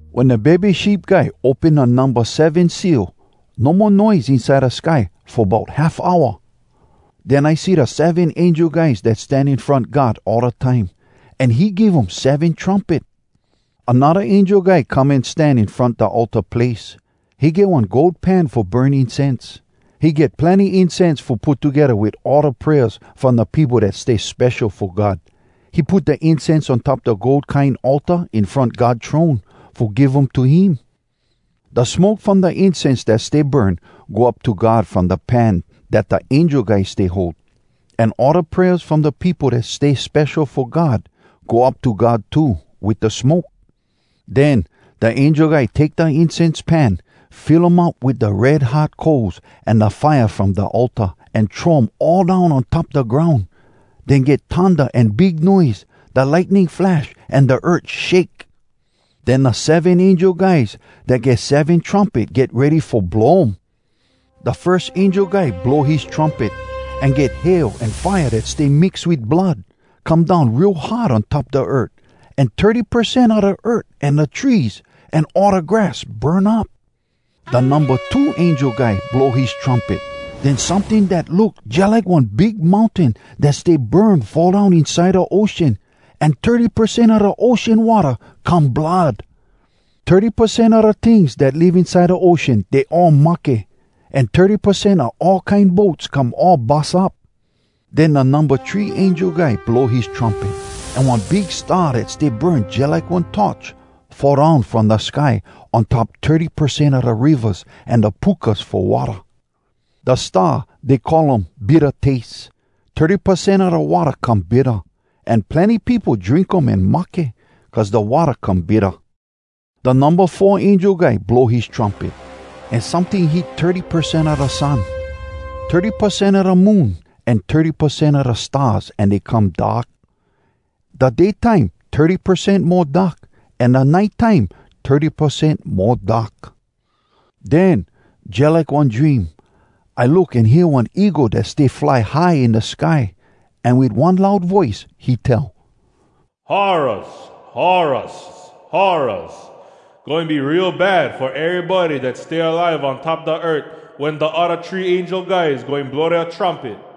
Wen da Bebe Sheep Guy open da numba seven seal, no mo noise inside da sky fo bout half hour. Den I see da seven angel guys dat stan in front God all da time, an he give um seven trumpet. Anodda angel guy come an stan in front da altar place. He get one gold pan fo burn incense. He get plenny incense fo put togedda wit all da prayers from da peopo dat stay spesho fo God. He put da incense on top da gold kine altar in front God throne, fo give um to him. Da smoke from da incense dat stay burn, go up to God from da pan dat da angel guy stay hold. An all da prayers from da peopo dat stay spesho fo God go up to God too, wit da smoke. Den da angel guy take da incense pan, fill um up wit da red hot coals an da fire from da altar, an throw um all down on top da groun. Den get thunda an big noise, da lightning flash, an da earth shake. Den da seven angel guys dat get seven trumpet get ready fo blow um. Da firs angel guy blow his trumpet. An get hail an fire dat stay mix wit blood, come down real hard on top da earth. An thirty percent a da earth an da trees, an all da grass burn up! Da numba two angel guy blow his trumpet. Den someting dat look jalike one big mountain dat stay burn fall down inside da ocean. An thirty percent a da ocean watta come blood. Thirty percent a da tings dat live inside da ocean, dey all mahke. An thirty percent a all kine boats come all bus up. Den da numba three angel guy blow his trumpet. An one big star dat stay burn jalike one torch, fall down from da sky on top thirty percent a da rivas an da pukas fo watta. Da star, dey call um “Bitta Taste.” Thirty percent all da watta come bitta, an plenny peopo drink um an mahke, cuz da watta come bitta. Da numba four angel guy blow his trumpet, an someting hit thirty percent a da sun, thirty percent a da moon, an thirty percent a da stars, an dey come dark. Da day time, thirty percent mo dark, an da nite time, thirty percent mo dark. Den, jalike one dream, I look an hear one eagle dat stay fly high in da sky. An wit one loud voice he tell, “Horraz! Horraz! Horraz! Goin be real bad fo erybody dat stay alive on top da earth wen da odda three angel guys goin blow dea trumpet!”